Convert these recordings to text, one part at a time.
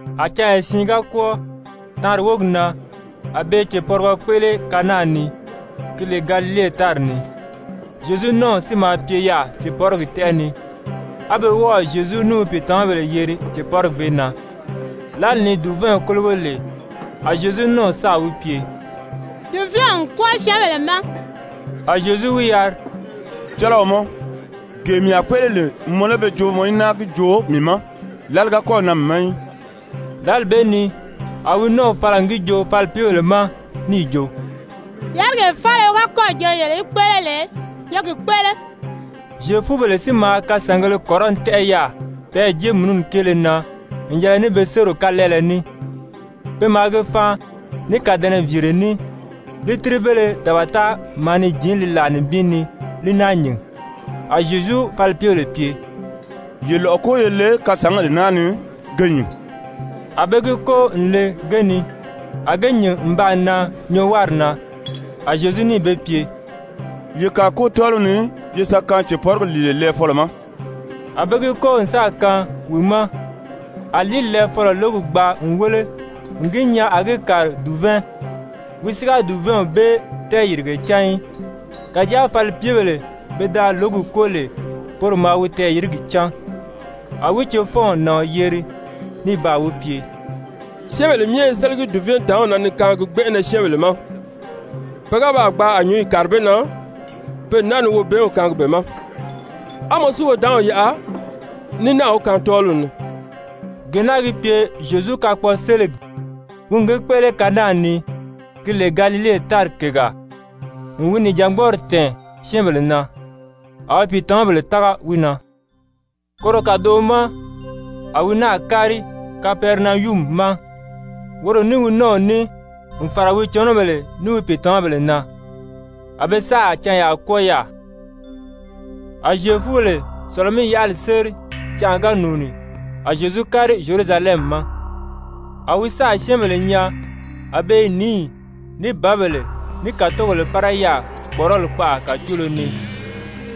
A canya siin ga kwɔ́ɔ, taanri wógi na a be i cèpɔrigɔ kpéʔele Kana ni, ki lè Galile tári ni. Zyezu nɔ́ɔw si maa pye yaà cèpɔrigi tɛ́ʔɛ ni. A be wɔ́ɔ̀ Zyezu ní wi pìitamabèle yeri cèpɔrigi bee na. Lǎli ni dùvɛɛnw kólogo lè, a Zyezu nɔ́ɔw sáà wi pye: «Dùvɛɛnw n kwɔ́ɔ syɛ́ɛnbèle ma.» A Zyezu wi yari: «Cɔlɔɔ mɔ, gee mii a kpéʔele lè, mɔ lé be joo mɔ í náa gi joo mii ma? Lǎli ga kɔ́ɔ̀ nan mii ma í.» Lǎli bee ni a wi nɔ́ɔw fala n gi joo falipyebèle ma níì jo: «Yárigee faala wi ga kɔ́ɔ̀ jo yele í kpéʔele lè, ye gi kpéʔele.» Zyefubèle si maa kasàngēle kɔrɔni tɛ́ʔɛ yaà peyɛɛ jéemununi kéele na n yɛlɛ ní be sériw kalɛɛlɛ ní, pe maa ge faan ní kàdɛnɛviire ní, lítiribéle dabata maa ni jǐn li làa nibin ni li náa nyìn, A Zyezu falipyebèle pye: «Ye lɔ̀ʔɔ kóo ye le kasǎngèle naa ni ge nyìn.» A be gi kóo n le ge ni, a ge nyìn n baa nan nyɔɔwari na. A Zyezu níì be pye: «Ye kàa kóo tɔ́ɔliw ni ye sa kaan cèpɔrigi lìile lɛɛfɔlɔ ma.» A be gi kóo n sáà kaan wi ma. A lìíli lɛɛfɔlɔ lǒgi gbaa n wéle n gi nyaa a gi kàri dùvɛɛn. Wi si ga dùvɛɛnw bee tɛɛyìrige cán í, kàjáa falipyebèle pe da lǒgi kóo lè, poro maa wi tɛɛyìrigi cán. A wi cefɔnw nàɔn yeri ní baa wi pye: «Syɛ́ɛnbèle myɛ i sélegi dùvɛɛntàánw na ni kaangi gbɛnʔɛnɛ syɛ́ɛnbèle ma, pe ga baa gbaa a nyǔnyi kàri be na, pe n náa ni wobɛɛnw kaangi be ma. A mɔ si wodaanw yaʔa ní náà wi kaan tɔ́ɔliw ni.» Gee naa gi pye Zyezu kakpɔɔseligi, wi n gi kpéʔele Kana ni, gi lè Galile tári kègaa, n wi nìjangbɔɔri tɛ̀ɛn syɛ́ɛnbèle na. A wi pìitamabèle tága wi na. Koro kàdoʔo ma a wi náà kári Kapɛrinayumi ma, woro ní wi nɔ́ɔw ní n fàra wi cɔnɔbèle ní wi pìitamabèle na. A be sáà canyaa kwɔ́ɔ yaà. A Zyefubèle Sɔ̀lɔ-mí-yaʔali séri canʔa ga nùuni, a Zyezu kári Zyerusalɛmi ma. A wi sáà syɛ́ɛnbèle nyaa a be i nǐyi, ní bǎbèle, ní kàtogèle pára yaà kpɔ̀ʔɔrɔli kpaʔa kàcoolo ni,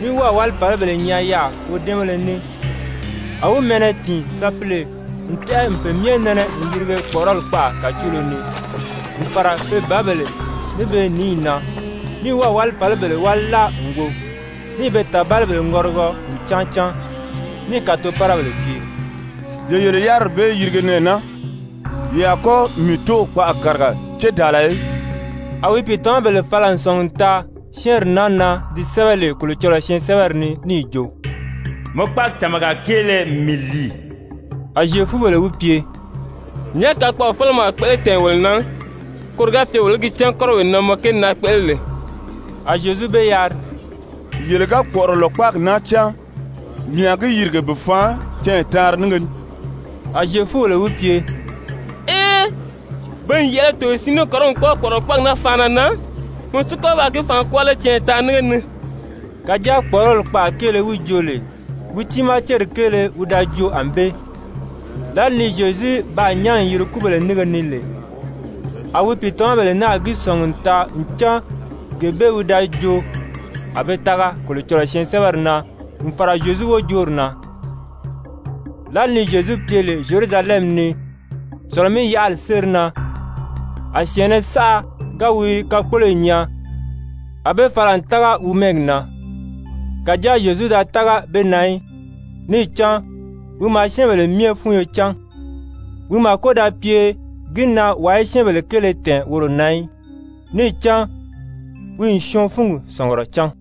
ní wɔ́ɔ̀ wálifalibèle nyaa yaà wodɛ́ɛnbéle ní. A wi mɛɛnnɛ tìin sapile n tɛ́ʔɛ n pe myɛ nɛnɛ n yirige kpɔ̀ʔɔrɔli kpaʔa kàcoolo ni, n fàra pe bǎbèle ní be nǐyi na, ní wɔ́ɔ̀ wálifalibèle wáli láa n wo, níì be tàbalibèle ŋɔrigɔ n cáan cáan. Níì kàtopárabèle pye: «Ye yele yáriri bee yirige nɛɛ naa, ye a kɔ́ mii Tóow kpaʔa kàriga cédaala í.» A wi pìitamabèle fala n sɔ̀ngi n taa syɛ́ɛnri naa na di sɛ́bɛ lè Kolocɔlɔɔ syɛɛnsɛbɛri ni níì jo: «Mɔ kpáagi tàmaga kéele n mii lìi.» A Zyefubèle wi pye: «Nyàʔá kakpɔɔfelege mɔ a kpéʔele tɛ̀ɛn wolo na, koro ga pye wolo í gi cán kɔ́rɔwee na mɔ kéeli naa kpéʔele lè?» A Zyezu be yari: «Yele ga kpɔ̀ʔɔrɔlɔ kpáagi naa cáan, mii a gi yìrige bi faan canya taanri nínge ni.» A Zyefubèle wi pye: «Ee, pe n yɛ̀ʔɛlɛ togoye siin ní kɔrɔni kwɔ́ɔ kpɔ̀ʔɔrɔlɔ kpáagi naa faanna na, mɔ si kɔ́ ba gi faan kwɔ́ɔ lé canya taanri nínge ni?» Kàjáa kpɔ̀ʔɔrɔli kpaʔa kéele wi joo lè, wi tiimaa céri kéele wi da joo ànbée. Lǎli ni Zyezu baa nyán n yiri kúbèle nínge ni lè, a wi pìitamabèle náà gi sɔ̀ngi n taa ncan gee bee wi da joo, a be tága Kolocɔlɔɔ syɛɛnsɛbɛri na n fàra Zyezu wojoori na. Lǎli ni Zyezu pye lè Zyerusalɛmi ni Sɔ̀lɔ-mí-yaʔali séri na, a syɛ̀ɛnnɛ saʔa ga wi kakpoloyi nyaa, a be fala n tága wi mɛ́ɛgi na. Kàjáa Zyezu da tága be na í, níì cán wi maa syɛ́ɛnbèle myɛ fúnyo cán. Wi màko da pye gi na wàa í syɛ́ɛnbèle kéele tɛ̀ɛn woro na í, níì cán wi n syɔɔn fúngi sɔ̀ngurɔ cán.